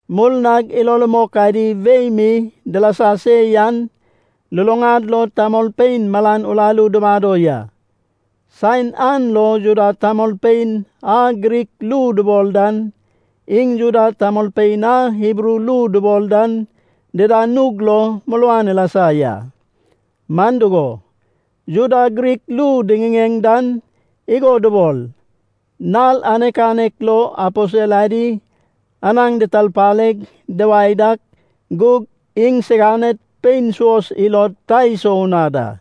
Murnag ilo rumok adi wei mi dilasa se yan, luluŋad lo tamolpein malan uraru dumado ya. Saen an lo, Juda tamolpein a Grik ru dubol dan, iŋ Juda tamolpein a Hibru ru dubol dan dida nug lo muruan ilasa ya. Man dugo, Juda Grik ru diŋiŋeŋ dan igo dubol, nal anek anek lo aposel adi anaŋ ditarpaleg duwae dak gug iŋsiganed pein suos ilod ta isou na da.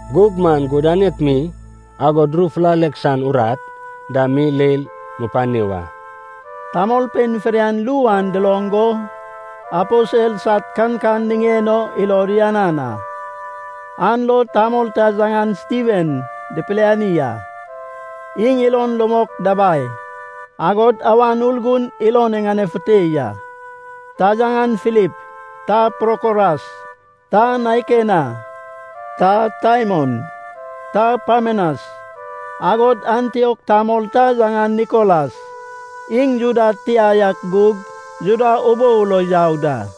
Gug maŋ gudanek mi, agod ru fulalek san urat dam mi leil mupani wa.” Tamolpein fidian ru an duloŋ go aposel sad kankan niŋen o ilod uyanan a. An lo tamol ta yaŋan Stiven dipiliani a. Iŋ ilon rumok dabai, agod Awan Urgun ilon iŋanefute ya. Ta yaŋan Filip, ta Prokoras, ta Naikena, ta Taimon, ta Parmenas, agod Antiok tamol ta yaŋan Nikolas, iŋ Juda tia yak gug Juda ubou lo yau da.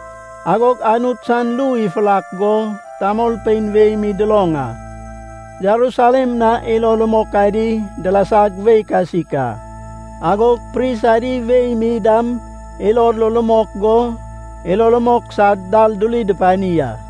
Agog Anut san ru ifurak go, tamolpein wei mi duloŋ a. Jerusalem na ilo rumok adi dilasag wei kasik a. Agog pris adi wei mi dam ilod lo rumok go, ilo rumok san dal duri dupani a.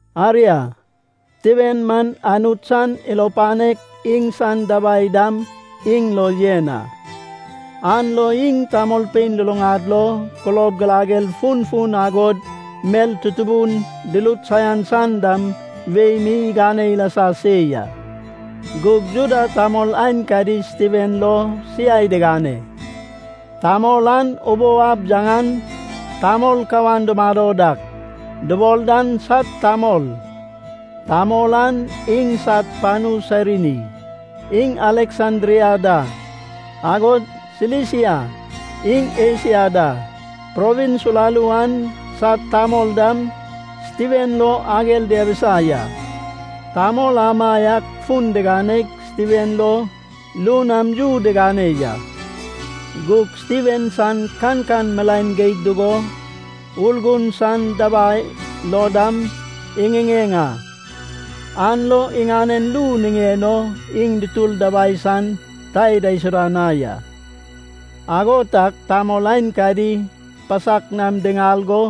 Aria, Stiven man Anut san ilo panek, iŋsan dabai dam iŋ lo yen a. An lo iŋ tamolpein luluŋad lo kulob girager funfun agod mel tutubun durut saian san dam wei mi igane ilasa se ya. Gug Juda tamol aenkadi Stiven lo siai digane. Tamol an ubou ab yaŋan “Tamol kawan dumado dak” dubol dan sad tamol. Tamol an iŋsad panu Sairini, iŋ Aleksandria da. Agod Silisia iŋ Esia da provins uraru an sad tamol dam Stiven lo ager diabisa ya. Tamol amaiak fun diganeg Stiven lo ru nam yu digane ya. Gug Stiven san kankan milaen geig dugo Urgun san dabai lo dam iŋiŋeŋ a, an lo iŋanen ru niŋen o iŋ dutur dabai san ta idaisuda na ya. Ago tag tamol aenkadi pasak nam diŋal go,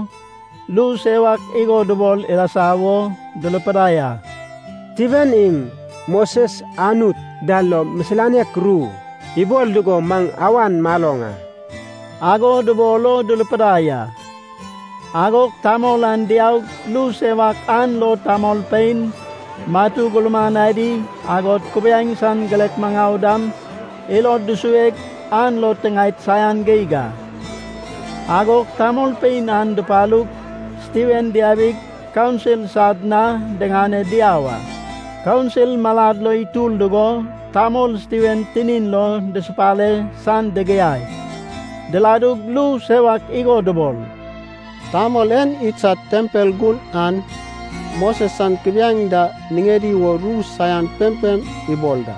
ru sewak igo dubol ilasa wo durupidai a. “Stiven iŋ Moses Anut da lo misilanek ru ibol dugo maŋ awan maloŋ a,” ago dubol o durupidai a. Agog tamol an diaug ru sewak an lo tamolpein, matu gurman adi, agod kubiaeŋ san girek maŋau dam ilod dusueg an lo tiŋaed saian geig a. Agog tamolpein an dupalug Stiven diabig, Kaunsil sad na diŋane diau a. Kaunsil malad lo itur dugo, tamol Stiven tinin lo dusupale san digiaig, diladug ru sewak igo dubol, “Tamol en idsad tempel gun an, Moses san kubiaeŋ da niŋedi wo ru saian pempem ibol da.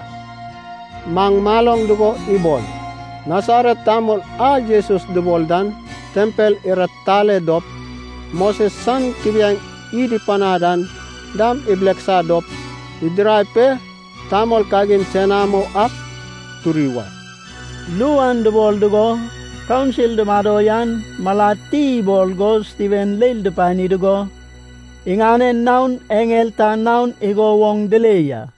Maŋ maloŋ dugo ibol, Nasaret tamol a Jesus dubol dan tempel iratitale dop, Moses san kubiaeŋ id ipanad an dam ibileksa dop idirad pe tamol kagin senamo ak turi wa.” Ru an dubol dugo Kaunsil dumado yan malad ti ibol go Stiven leil dupani dugo, iŋanen naon eŋel ta naon igo woŋ dile ya.